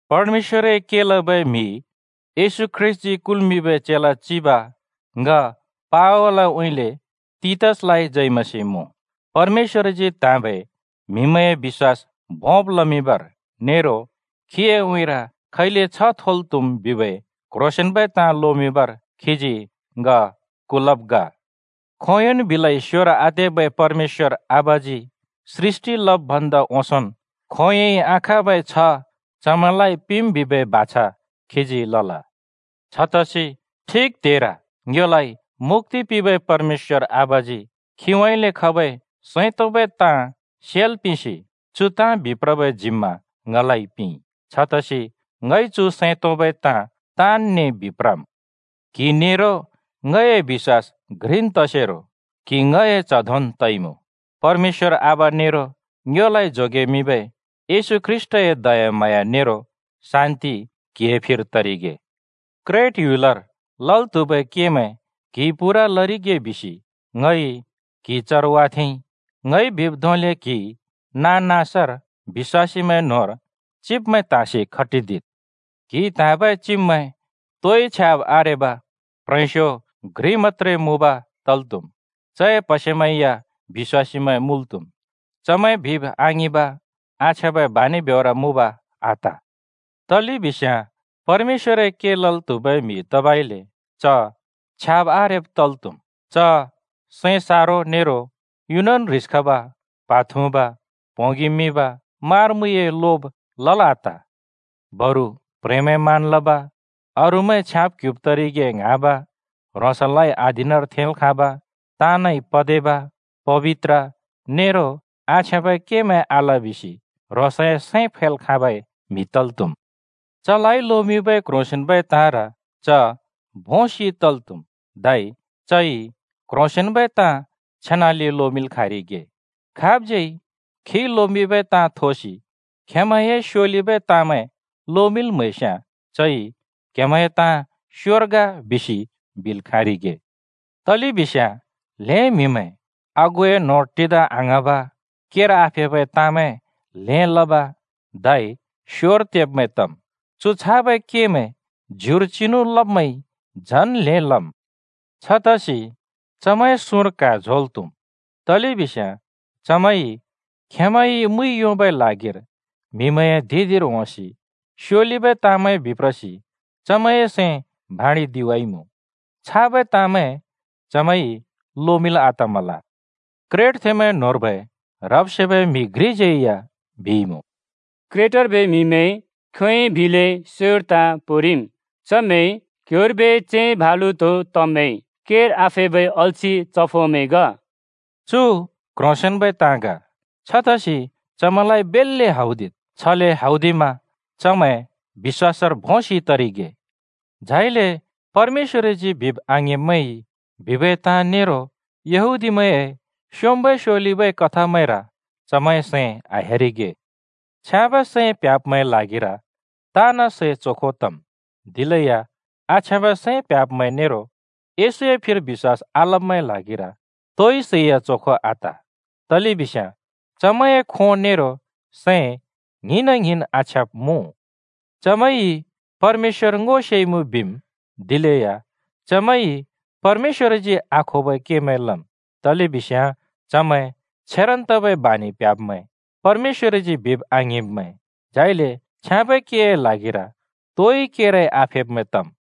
परमेश्‍वरए के लबै म्हि, येशू ख्रीष्‍टजी कुल्मिंबै चेला चिब ङ पावलउँइँले तीतसलाइ जय मसीह मुँ। परमेश्‍वरजी त्‍हाँबै म्‍हिमैंए बिश्‍वास भोंब् लमिंबर नेरो खीए उँइँर खैले छ्याँबै छ्ह थोल् त्‍हुम् बिबै क्ह्रोंसेंन्बै ताँ लोमिंबर खीजी ङ कुलब् ग। खोंयोंन् बिलै स्योर आतेबै परमेश्‍वर आबाजी सृष्‍टि लब् भन्दा ओंसोंन् खोंयोंइ आखाँबै छ्ह चमैंलाइ पिंम् बिबै बाछा खीजी लल। छतसि ठिक त्हेर ङ्योलाइ मुक्‍ति पिंबै परमेश्‍वर आबाजी खीउँइँले खबै सैं तोंबै ताँ सेल् पिंसि चु ताँ बिप्रबै जिम्मा ङलाइ पिंइ। छतसि ङइ चु सैं तोंबै ताँ ताँनने बिप्रम्। क्हि नेरो ङए बिश्‍वास घ्रिन् तसेरो क्हि ङए च्‍ह धोंन् तइमुँ। परमेश्‍वर आबा नेरो ङ्योलाइ जोगेमिंबै येशू ख्रीष्‍टए दयाम्हाँया नेरो शान्ति क्हिए फिर तरिगे। क्रेट ह्‍युलर लल् त्हुबै केमैं क्‍हिइ पूरा लरिगे बिसि ङइ क्‍हि चर वाथेंइ। ङइ बिब् धोंले क्हिइ नाँ-नाँसर बिश्‍वासीमैं न्‍होंर चिब्मैं त्हाँसि खटिदिद्। क्हिइ त्हाँबै चिब्मैं तोइ छ्याब् आरेब, प्ह्रेंस्यो घ्रि मत्‍त्रे मुँब तल् त्‍हुम्। चए प्‍हसेमैं या बिश्‍वासीमैं मुँल् त्‍हुम्, चमैं बिब् आङिंब, आछ्याँबै बानि ब्योर मुँब आत। तलेबिस्याँ परमेश्‍वरए के लल् त्हुबै म्‍हि तबइले च छ्याब् आरेब तल् त्‍हुम्। च सैं सारो नेरो युनन् ह्रिस खब, प्हा थुँब, प्‍होंगि मिब, मारा-मुइए लोब लल् आत। बरु प्‍ह्रेंमैं मान लब, अरूमैं छयाँब्-क्ह्‍युब् तरिगे ङ्हाँब, ह्रोंसलाइ अधीनर थेंल् खाँब, ताँनइ पदेवा, पबित्र, नेरो आछ्याँबै केमैं आल बिसि ह्रोंसए सैं फैल् खाँबै म्‍हि तल् त्‍हुम्। चलाइ लोमिंबै क्ह्रोंसेंन्बै ताँर च भोंसि तल् त्हुम्, धै चइ क्ह्रोंसेंन्बै ताँ छेनाले लोमिंल् खाँरिगे, खाबज्यै खिइ लोमिंबै ताँ थोसि खेंमैंए स्योलिबै ताँमैं लोमिंल् म्हैस्याँ चइ “क्हेमैंए ताँ स्योर ग” बिसि बिल् खाँरिगे। तलेबिस्याँ ल्‍हें म्‍हिमैं आगुए न्होंर टिदा आङ्हाँब, केर आफेबै ताँमैं ल्हें लब धै स्योर तेब्मैं तम्। चु छाबै केमैं ज्युर चिनु लब्मैंइ झन् ल्हें लम्। छतसि चमैंए सुँर क्हा झोंल् त्‍हुम्, तलेबिस्याँ चमैंइ खेंमैंइ मुइ योंबै ल्हागिर म्हिमैंए धिं-धिंर होंसि स्योलिबै ताँमैं बिप्रसि चमैंए सैं भाँडिदिवाइमुँ। छाबै ताँमैं चमैंइ लोमिंल् आतमल। क्रेटथेंमैं न्‍होंर्बै ह्रब् सेबै म्‍हि घ्रिज्‍यै या बिइमुँ, “क्रेटर्बै म्‍हिमैं खोंयोंइ बिलै स्‍योर ताँ पोंरिम्, चमैं क्ह्‍योंर्बै सिंह भालु धों तब्मैं, केर आफेबै अल्छि चफोमैं ग।” चु क्‍ह्रोंसेंन्बै ताँ ग। छतसि चमैंलाइ बेल्‍ले हौदिद्। छले हौदिमा चमैं बिश्‍वासर भोंसि तरिगे, झाइले परमेश्‍वरजी बिब् आङिंब्मैंइ बिबै ताँ नेरो यहूदीमैंए स्योंम्बै स्‍योलिबै कथामैंर चमैंए सैं आह्‍यारिगे। छ्याँबै सैं प्ह्‍याब्मैंए ल्हागिर ताँन् सै चोखो तम्। दिलेया आछ्याँबै सैं प्ह्‍याब्मैं नेरो येशूए फिर बिश्‍वास आलब्मैंए ल्हागिर तोइ सैया चोखो आत, तलेबिस्याँ चमैंए खों नेरो सैं ङ्हिंना ङ्हिन् आछ्याँब् मुँ। चमैंइ परमेश्‍वर ङो सेइमुँ बिम्, दिलेया चमैंइ परमेश्‍वरजी आखोबै केमैं लम्, तलेबिस्याँ चमैंइ छेरन् तबै बानि प्ह्‍याब्मैं, परमेश्‍वरजी बिब आङिंब्मैं, झाइले छ्याँबै केए ल्हागिर तोइ केरै आफेब्मैं तम्।